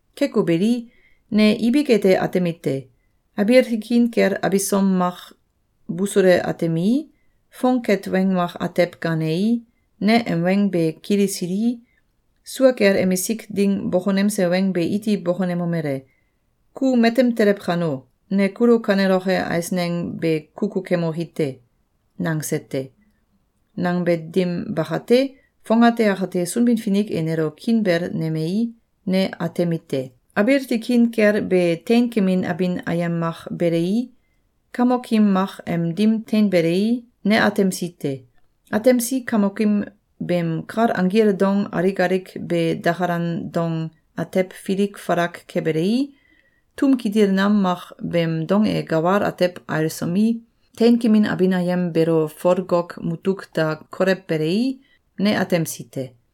Keko beli, ne ibik ete atemite: Abiil tikin kel abisom mak busule atemii, fongket weng mak atew gaanei, ne em weng be kilisilii, sua kel emisik ding bokonemse weng be iti bokonemomele: “Ku matem telew kano, ne kulo kaneloke eisneng be kukukemoki te.”, nangse te. Nangbe dim bakate, fongate akate Sunbin-Finik e nelo kiinbel nemei, ne atemite: Abiil tikin kel be teinkemin abin ayem mak belei, Kamokim mak em dim teinbelei, ne atemsi te. Atemsi kamokim beem kal anggil dong alik alik be dakalan dong atew filik falak kebelei, tum kitil nam mak beem dong e gawal atew ailsomi, teinkemin abin ayem beelo folgok mutuk da kolewbelei, ne atemsi te.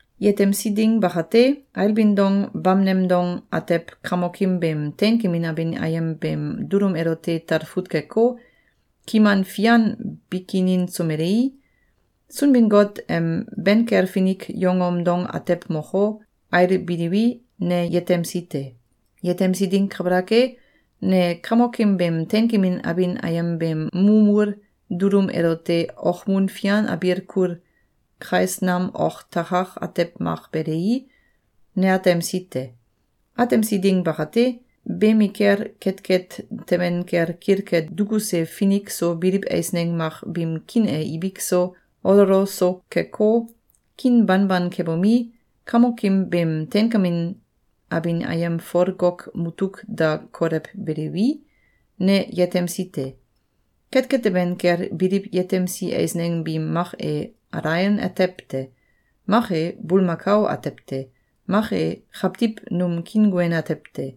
Yetemsi ding bakate, ailbin dong bamneng dong atew Kamokim beem teinkemin abin ayem beem dulum elote talfut keko, kiman fian bikininsomelei, Sunbin-Got em ben kel finik yongom dong atew moko, ailbiliwi, ne yetemsi te. Yetemsi ding kabalak e, ne Kamokim beem teinkemin abin ayem beem mumul dulum elote okmun fian abiil kul kais nam ok takak atew mak belei, ne atemsi te. Atemsi ding bakate, beemikel ketket teben kel kilke dukuse finik so biliw eisneng mak biim kiin e ibik so, ololo so keko, kiin banban kebomi, Kamokim beem teinkamin abin ayem folgok mutuk da kolewbeliwi, ne yetemsi te. Ketket teben kel biliw yetemsi eisneng biim mak e alaion atew te. Mak e, bulmakao atew te. Mak e, kawtiw num kiinguen atew te.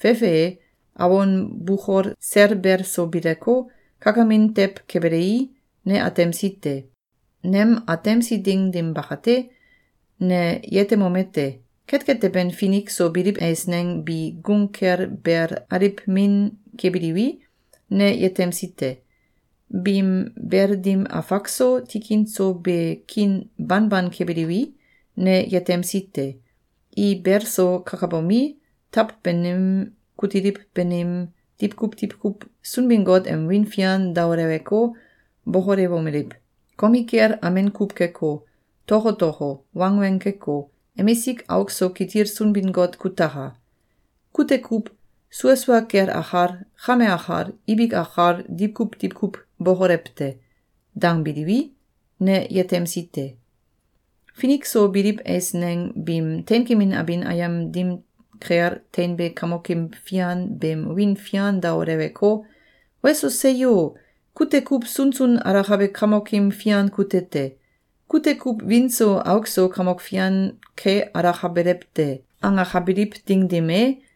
Fefe e, awon bukol sel bel so bileko, kakamin tew kebelei, ne atemsi te. Nem atemsi ding dim bakate, ne yetemomete: Ketket teben finik so biliw eisneng bi gung kel bel aliw min kebiliwi, ne yetemsi te. Biim bel dim afak so, tikin so be kiin banban kebiliwi, ne yetemsi te. I bel so kakabomi, taw banim kutiliw banim, diwkuw diwkuw Sunbin-Got em wiin fian daoleweko, bokolewomeliw: “Komikel amen kuw keko, tokotoko, wangweng keko, emisik auk so kitil Sunbin-Got kutaka! Kute kuw sua sua kel akal, kame akal, ibik akal diwkuw diwkuw bokolew te.”, dangbiliwi, ne yetemsi te. Finik so biliw eisneng biim teinkemin abin ayem dim kel teinbe Kamokim fian beem wiin fian daoleweko, “Weso! Seyo! Kute kuw sunsun alakabe Kamokim fian kute te. Kute kuw wiin so auk so Kamok Fian ke alakabelew te!”, angakabiliw ding dim e,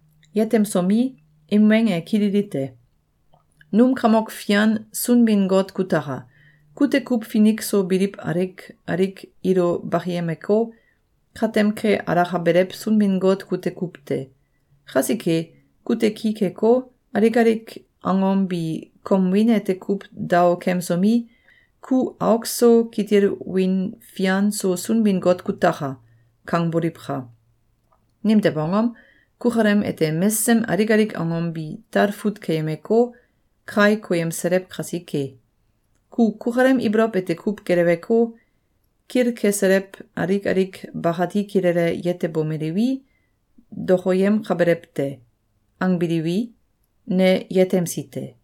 Yetemsomi, im weng e kililite: “Num Kamok Fian Sunbin-Got kutaka! Kute kuw finik so biliw alik alik ilo bakiyemeko, katem ke alakabelew Sunbin-Got kute kuw te. Kasike, kute ki keko, alik alik angom bi kom wiin ete kuw daokemsomi, ‘Ku auk so kitil wiin fian so Sunbin-Got kutaka!’, kangboliwka! Nimtew angom? Kukalem ete mesesem alik alik angom bi talfut keyemeko, kai koyemselew kasike. Ku kukalem ibolow ete kuw geleweko, kilkeselew alik alik bakati kilele yetebomelewi, dokoyemkabelew te.”, angbiliwi, ne yetemsi te.